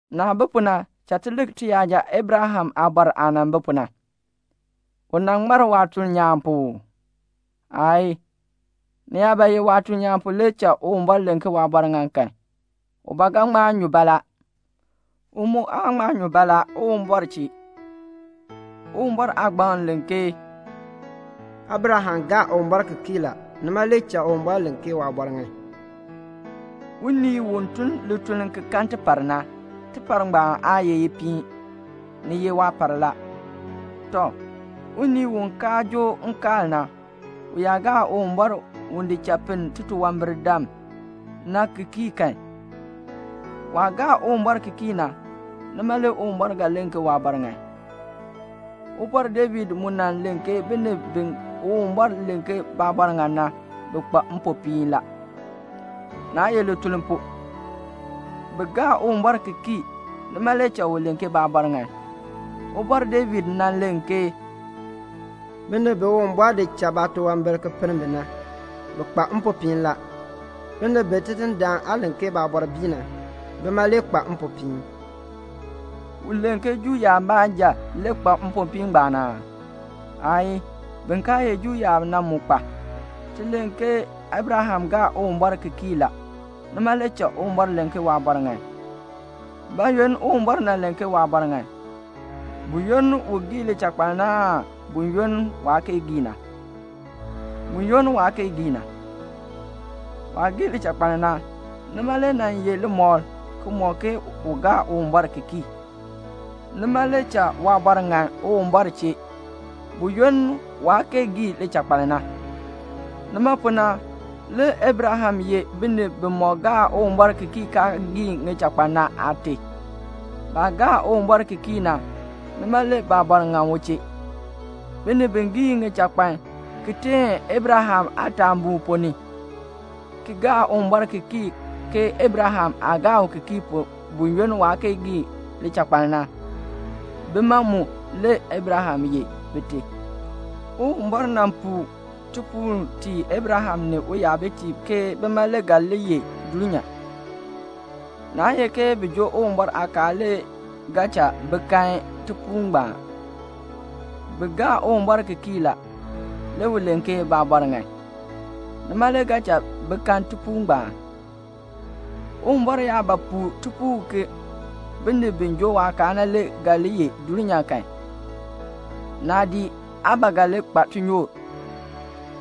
Naah bi pu na, cha ti lik tiyaja Abraham aabɔr aah nan bi pu na. U nan ŋmar waatuln nyaan pu uu? Aayii. Ni yaa ba ye waatuln nyaan pu le cha Uwumbɔr len ke waabɔr ŋan kan, u ba ga ŋma nyu baalaa la. U mu aa ŋma nyu baalaa Uwumbɔr chee. Uwumbɔr Aagbaŋ len ke "Abraham gaa Uwumbɔr ki kii la, nima le cha Uwumbɔr len ke waabɔr ŋan." Unii u tun lituln ki kan tipar na, tipar ngbaan aa ye ipiin. Ni ye waapar la. Tɔ, unii u kaa joo nkaal na, u yaa gaa Uwumbɔr u di cha pinn titunwambirdam na ki kii kan, waah gaa Uwumbɔr ki kii na, nima le Uwumbɔr ga len ke waabɔr ŋan. Ubɔr David mu nan len ke binib bi Uwumbɔr len ke baabɔr ŋan na, bi kpa mpopiin la. Naa ye lituln pu; bi gaa Uwumbɔr ki kii, nima le cha u len ke baabɔr ŋan. Ubɔr David nan len ke "Binib bi Uwumbɔr di cha baatunwambir ki pinn bi na, bi kpa mpopiin la. Binib bi Tidindaan aan len ke baabɔr bii na, bima le kpa mpopiin." U len ke Juu yaab baanja le kpa mpopiin ngbaan aa? Aayii. Bin kaa ye Juu yaab na mu kpa. Ti len ke Abraham gaa Uwumbɔr ki kii la, nima le cha Uwumbɔr len ke waabɔr ŋan. Bayoonn Uwumbɔr len ke waabɔr ŋan? Buyoonn u gii lichakpaln na aan buyoonn waa kee gii na? Buyoonn waa kee gii na. Waah gii lichakpaln na, nima le nan ye limɔkl ki mɔk ke u gaa Uwumbɔr ki kii, nima le cha waabɔr ŋan Uwumbɔr chee, buyoonn waa kee gii lichakpaln na. Nima pu na le Abraham ye binib bimɔk gaa Uwumbɔr ki kii kaa gii ŋichakpan na aate. Baah gaa Uwumbɔr ki kii na, nima le baabɔr ŋan u chee. Binib bi gii ŋichakpan, ki teen Abraham aataabuu ponn ni, ki gaa Uwumbɔr ki kii ke Abraham aah gaa u ki kii pu buyoonn waa kee gii lichakpaln na, bima mu le Abraham ye bite. Uwumbɔr nan puu tipuul tii Abraham ni uyabitiib ke bima le ga li yeh dulnyaa. Naa ye ke bi joo Uwumbɔr aakaal le ga cha bi kan tipuul ngbaan. Bi gaa Uwumbɔr ki kii la. Le u len ke baabɔr ŋan. Nima le ga cha bi kan tipuul ngbaan. Uwumbɔr yaa ba puu tipuul ke binib bi joo waakaal na le ga li yeh dulnyaa kan, naadii aa ba ga li kpa tinyoor.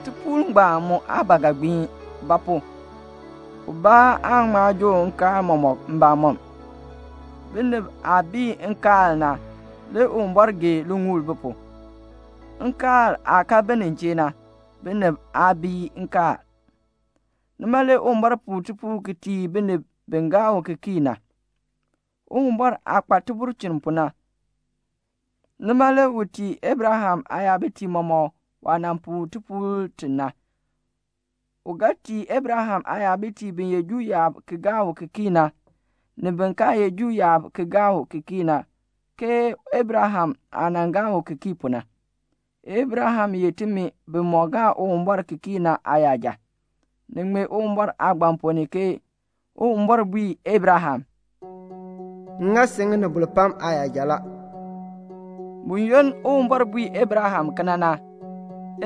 Tipuul ngbaan mu aa ba ga gbiin; ba pu? ubaa aan ŋma joo nkaal mɔmɔk mbamɔm. Binib aah bii nkaal na, le Uwumbɔr gee liŋuul bi pu. Nkaal aah kaa bi nin chee na, binib aa bii nkaal. Nima le Uwumbɔr puu tipuul ki tii binib bi gaa u ki kii na. Uwumbɔr aah kpa tibulchin pu na, nima le u tii Abraham aayabitiib mɔmɔk waah nan puu tipuul ti na. U ga tii Abraham aayabitiib bi ye Juu yaab ki gaa u ki kii na, ni bin kaa ye Juu yaab ki gaa u ki kii na ke Abraham aah nan gaa u ki kii pu na. Abraham ye timi bimɔk gaa Uwumbɔr ki kii na aayaja. Ni ŋmee Uwumbɔr Aagbaŋ ponn ni ke Uwumbɔr bui Abraham, "M ŋa si ŋinibol pam aayaja la." Buyoonn Uwumbɔr bui Abraham kena na,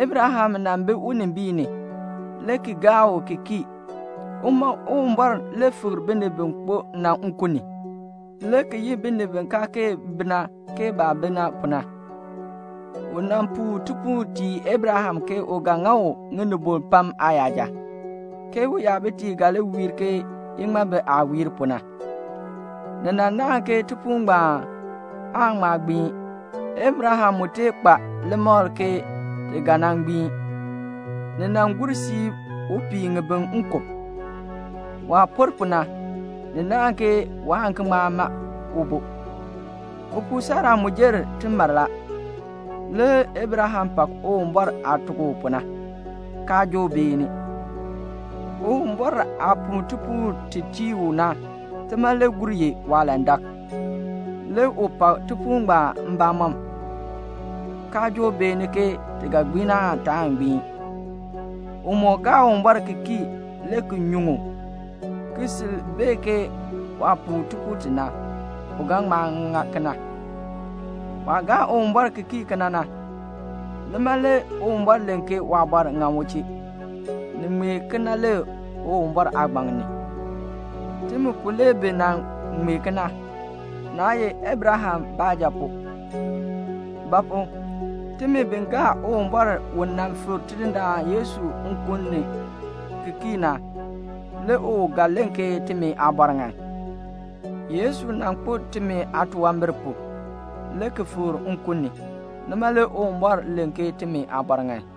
Abraham nan bi unimbiin ni, le ki gaa u ki kii. Uma Uwumbɔr le fikr binib bi kpo na nkun ni, le ki yi binib bi kaa kee bi na, ke baah bi na pu na. U nan puu tipuul tii Abraham ke u ga ŋa u ŋinibol pam aayaja, ke uyabitiib ga li wiir ke iŋmabi aah wiir pu na. Ni nan naahn ke tipuul ngbaan aan ŋma gbiin. Abraham mu tee kpa limakl ke ti ga nan gbiin. Ni nan gur siib u pii ŋibin nkub. Waah por pu na, ni naahn ke waan ki ŋma ma ubo. Upuu Sara mu jer timar la. Le Abraham pak Uwumbɔr aah tuk u pu na, kaa joo beeni. Uwumbɔr aah puu tipuul ti tii u na, tima le gur ye waalandak. Le u pak tipuul ngbaan mbamɔm, kaa joo beeni ke ti ga gbiin aan taan gbiin? U moo gaa Uwumbɔr ki kii le ki nyuŋ u, ki sil bee ke waah puu tipuul ti na, u ga ŋma ŋa kena. Waah gaa Uwumbɔr ki kii kena na, nima le Uwumbɔr len ke waabɔr ŋan u chee. Ni ŋmee kena la, le Uwumbɔr Aagbaŋ ni. Timi pu le bi nan ŋmee kena, naa ye Abraham baanja pu; ba pu? timi bi gaa Uwumbɔr u nan fikr Tidindaan Yesu nkun ni na ki kii, le u ga len ki timi aabɔr ŋan. Yesu nan kpo timi aatunwambir pu, le ki fikr nkun ni. Nima le Uwumbɔr len ke timi aabɔr ŋan.